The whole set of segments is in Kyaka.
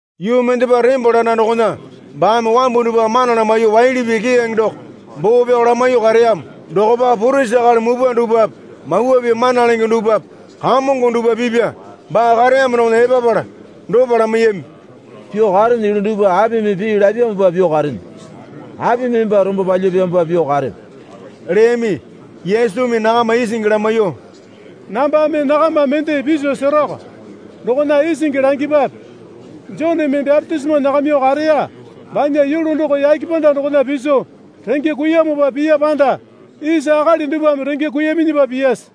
Yuu mendepa tembole anda dokona baame wambu dupwa mana lamaiyuo waili pii keyange doko boo pyao lamaiyuo kareyamo dokopa purisi akali mupwa dupwape Mawa Pii mana lenge dupwape kamongo dupwa pipya baa kareyamo dokona epapala dopa lamaiyami. Pyuo karene yulu dupwa apimi pii lapyamopa pyuo karene? Apimi emba rombo palyapyamopa pyuo karepe? leyami. Yesumi nakama isingi lamaiyuo, Nambame nakama mende piso seroko. Dokona isingi langipwape. Joneme bapitisimo nyakamyuo kareya banya yulu doko yake panda dokona piso renge kuiyamopa piya panda isa akali dupwame renge kuiyaminyipa piyase?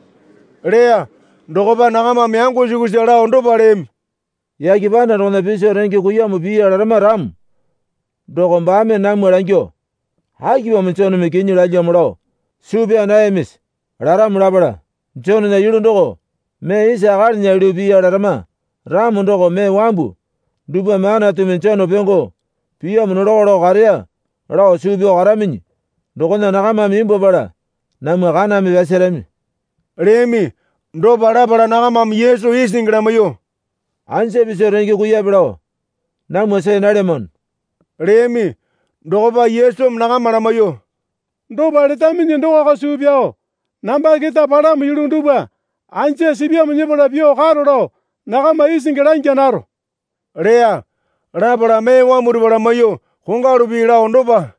leya. Dokopa nakamame yango sukusa lao dopa leyami. Yake panda dokona piso renge kuiyamo piya larama ramo doko baame namwa langyuo, Akipamo Joneme kinyi lalyamo lao suu pyaa nayamisi? laramo lapala, Jonena yulu doko mee isa akalinya yulu piya larama ramo doko mee wambu dupwame Anatumi Jone pyongo piyamo nolako lao kareya lao suu pyao karaminyi dokona nakamame imbwuapala namwa kaname pyasarami leyami. Dopa lapala nakamame Yesu isingi lamaiyuo, Anja piso renge kuiyape lao namwa see nalyamano, leyami. Dokopa Yesumi nakama lamaiyuo, Dopa letaminyi dokoko suu pyao namba keta palamo yulu dupwa anja sipyamo nyepala pyuo karo lao nakama isingi langya naro leya. Lapala mee wambu dupwa lamaiyuo kongwalu pii lao dopa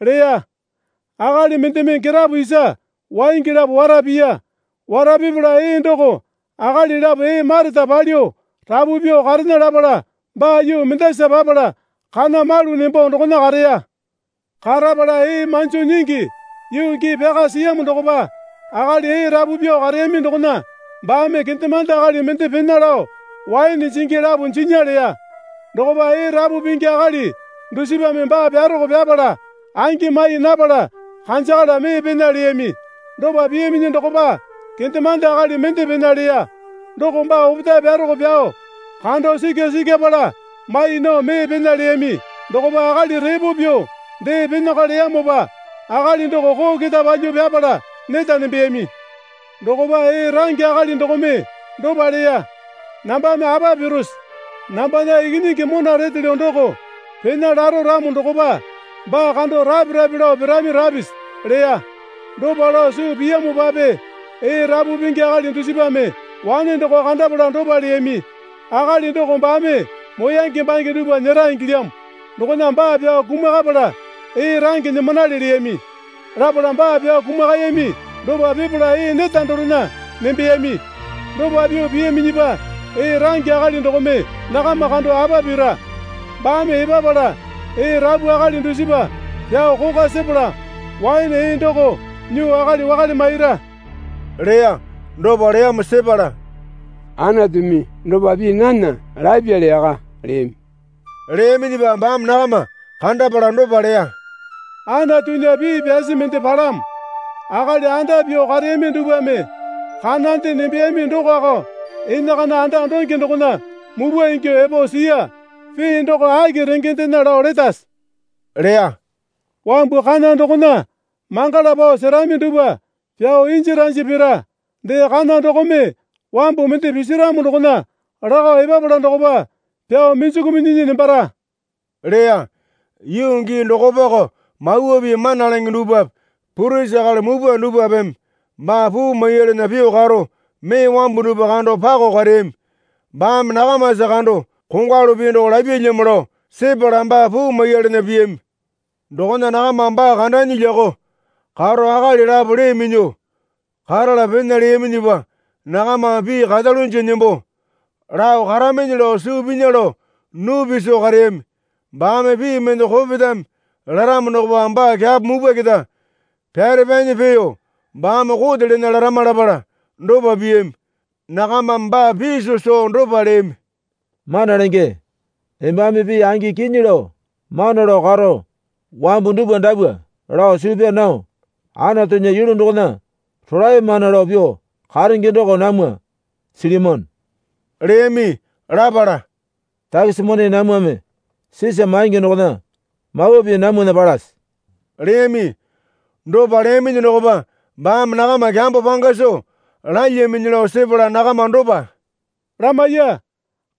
leya. Akali mendeme girapo isa waingi lapo wara piya. Wara pipala ee doko akali lapo ee mareta palyuo rapu pyuo karena lapala baa yuu mendasa papala kana malu nembo dokona kareya. Karapala ee manjo nyingi yuu gii pyaka siyamo dokopa akali ee rapu pyuo kareyami dokona baame kendemande akali mende pena lao waene jingi lapo jinya leya. Dokopa ee rapu pingi akali dusipame baa pyaroko pyapala angi mai napala kanjakala mee pena leyami. Dopa piyaminyi dokopa kendemande akali mende pena leya. Doko baa opetae pyaroko pyao kando sikya sikyapala mai nao mee pena leyami. Dokopa akali repo pyuo dee penako leyamopa akali doko koo keta palyuo pyapala neta nembeyami. Dokopa ee range akali dokome dopa leya. Nambame apa pirose? Nambana ikinyingi mona retelyo doko pena laro ramo dokopa, baa kando rape rape lao pirami rapisi, leya. Dopa lao suu piyamopape ee rapu pingi akali dusipame wane doko kandapala dopa leyami. Akali doko baame moyange bange dupwa nyera ingilyamo. Dokona baa pyao kumakapala ee range nyimanale leyami. Lapala baa pyao kumakayami dopa pipala ee neta dorena nembeyami. Dopa pyuo piyaminyipa, ee range akali dokome nakama kando apa pira? Baame epapala ee rapu akali dusipa pyao kokwa sepala waene ee doko nyuo akali wakale maira leya. Dopa leyamo sepala, Anatumi dopa pii nana lapyali yaka, leyami. Leyaminyipa baame nakama kandapala dopa leya. Anatunya pii pyasi mende palamo. Akali anda pyuo kareyami dupwame kanande nembeyami dokoko enakana anda donge dokona mupwa ingyuo epo siya, pii doko aki rengendena lao letase? leya. Wambu kana dokona mangala nao serami dupwa pyao inji ranji pira. Dee kana dokome wambu mende pisiramo dokona lakao epapala dokopa pyuo minjuku minyinyi nembara leya. Yuu gii dokopako Mawa Pii mana lenge dupwape purisi akali mupwa dupwapeme baa puu maiyalana pyuo karo mee wambu dupwa kando pakao kareyami. Baame nakamasa kando kongwalu pii doko lapyalyamo lao sepala baa puu maiyalana piyami. Dokona nakamame baa kandanyi lyakao karo akali lapo lee minyuo karala pena leyaminyipa nakamame pii karalunja nembo lao karaminyi lao suu pinya lao nupi soo kareyami. Baame pii mende kopetame laramo dokopa baa kyapo mupwa keta pyarapanyi peeyo baame kote lena larama lapala dopa piyami. Nakamame baa piso soo dopa leyami. Mana Lenge, embame pii angi kinyi lao mana lao karo wambu dupwa dapwa lao suu pyaa nao Anatunya yulu dokona rolae mana lao pyuo karenge doko namwa silyamano, leyami. Lapala, Takisi mone namwame Sisa maingi dokona Mawa Pii namwana palase? leyami. Dopa leyaminyi dokopa baame nakama kyambo panga soo lalyaminyi lao sepala nakama dopa lamaiya.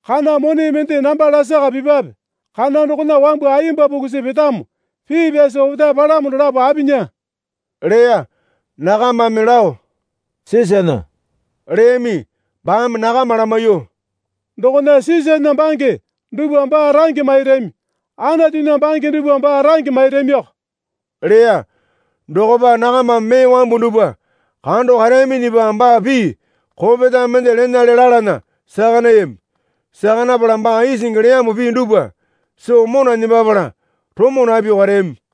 Kana mone mende namba lasaka pipwape. Kana dokona wambu ayemba pukusi petamo, pii pyasi opetae palamo dolapo apinya? leya. Nakamame lao Sisana leyami. Baame nakama lamaiyuo, Dokona Sisana bange dupwa baa range mairami. Anatunya bange dupwa baa range mairamiko leya. Dokopa nakamame mee wambu dupwa kando kareyaminyipa baa pii kopetame mende lenale lalana saka nayami. Saka napala baa isingi leyamo pii dupwa soo mona nembapala romo napyuo kareyami.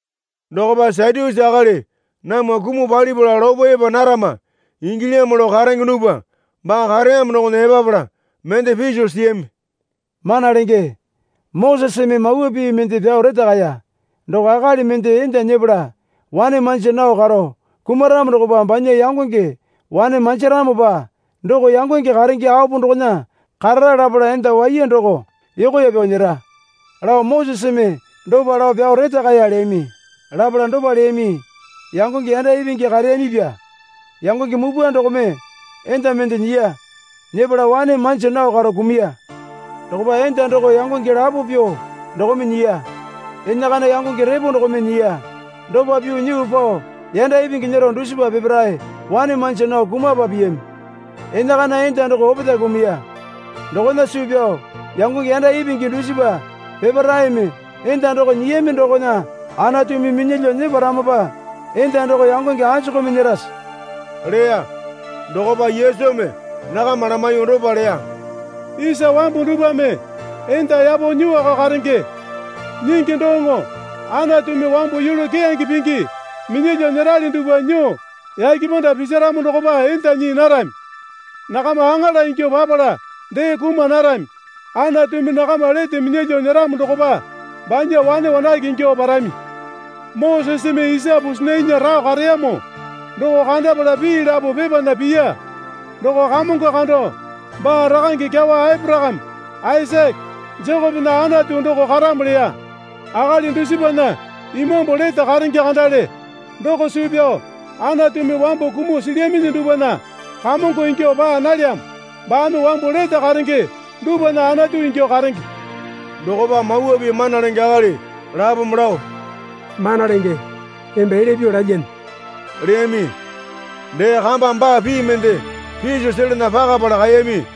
Dokopa Satyusi akali namwa kumuo palipala lopo epa narama ingilyamo lao karenge dupwa baa kareyamo dokona epapala mende piso siyami. Mana Lenge, Moseseme mawa pii mende pyao retakaya. Doko akali mende enda nyepala wane manja nao karo kumaramo dokopa banya yangonge wane manjaronopa doko yangonge karenge apo dokona karara lapala enda waiya doko yokoya pyao nyera, lao Moseseme dopa lao pyao retakaya leyami. Lapala dopa leyami. Yangonge yanda ipingi kareyamipya. Yangonge mupwa dokome enda mende nyiya. Nyepala wane manja nao karo kumuya. Dokopa enda doko yangonge lapo pyuo dokome nyiya. Enakana yangonge repo dokome nyiya. Dopa pyuo nyuo pao yanda ipingi nyero dusipa peparae wane manja nao kumapa piyami. Enakana enda doko opetae kumuya. Dokona suu yao yangonge yanda ipingi dusipa peparaeme enda doko nyiyami dokona Anatumi minyalyuo nyeparamopa enda doko yangonge anjukumi nyerase? leya. Dokopa Yesumi nakama lamaiyuo dopa leya. Isa wambu dupwame enda yapo nyuoko karenge. Nyingi doŋo Anatumi wambu yulu keyange pingi minyalyuo nyerali dupwa nyuo yake panda pisaramo dokopa enda nyii narami. Nakama aŋala ingyuo papala dee kuma narami. Anatumi nakama lete minyalyuo nyeramo dokopa banya wane wanake ingyuo parami. Moseseme isa pusinainya rao kareyamo doko kandapala pii lapo pepana piya. Doko Kamongo kando baa rakange kyawa Aporakame, Aisake, Jekopena Anatu doko karamo leya. Akali dusipana imambu lete karenge kandale. Doko suu pyao Anatumi wambu kumuo silyaminyi dupwana Kamongo ingyuo paa nalyamo. Baame wambu lete karenge dupwana Anatu ingyuo karenge. Dokopa Mawa Pii mana lenge akali lapome lao, Mana Lenge, emba elya pyuo lalyane leyami. Dee kamba baa pii mende piso selana pakapala kaeyami.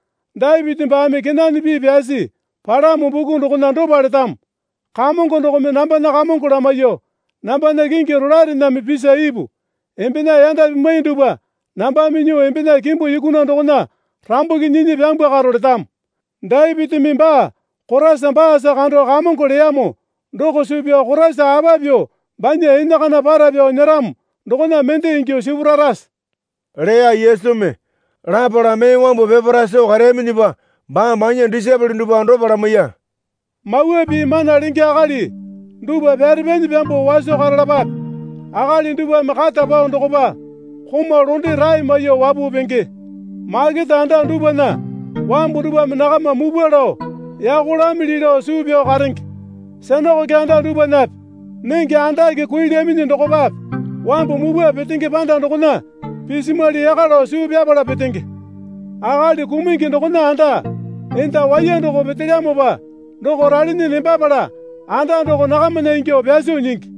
Dapiti baame kenane pii pyasi palamo buku dokona dopa letamo. Kamongo dokome nambana Kamongo lamaiyuo, nambana kingi rolaerename pisa ipu. Embena yanda pimwai dupwa nambame nyuo embena kimbu yukuna dokona rambuki nyinyi pyambwakaro, letamo. Dapitimi baa Koraisa baasa kando Kamongo leyamo doko suu pyao Koraisa apa pyuo banya enakana para pyao nyeramo dokona mende ingyuo sipurarase? leya Yesumi. Lapala mee wambu peparae soo kareyaminyipa baame banya disaepole dupwa dopa lamaiya. Mawa Pii mana lenge akali dupwa pyarepanyi pyambuo waso karalapape. Akali dupwame kata pao dokopa komau londe rae maiyuo wapuo penge. Makete anda dupwana wambu dupwame nakama mupwa lao yako lamili lao suu pyao karenge. Sinakoke anda dupwanape nenge andake kuilyaminyi dokopape wambu mupwa petenge panda dokona pisimwali yaka lao suu pyapala petenge. Akali kumungi dokona anda enda waiya doko petelyamopa doko ralinyi nembapala anda doko nakamana ingyuo pyaso nyingi.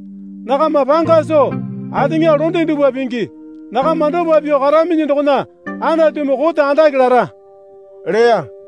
Nakama panga soo ateŋa londe dupwa pingi. Nakama dopa pyuo karaminyi dokona Anatumi kote andake lara leya.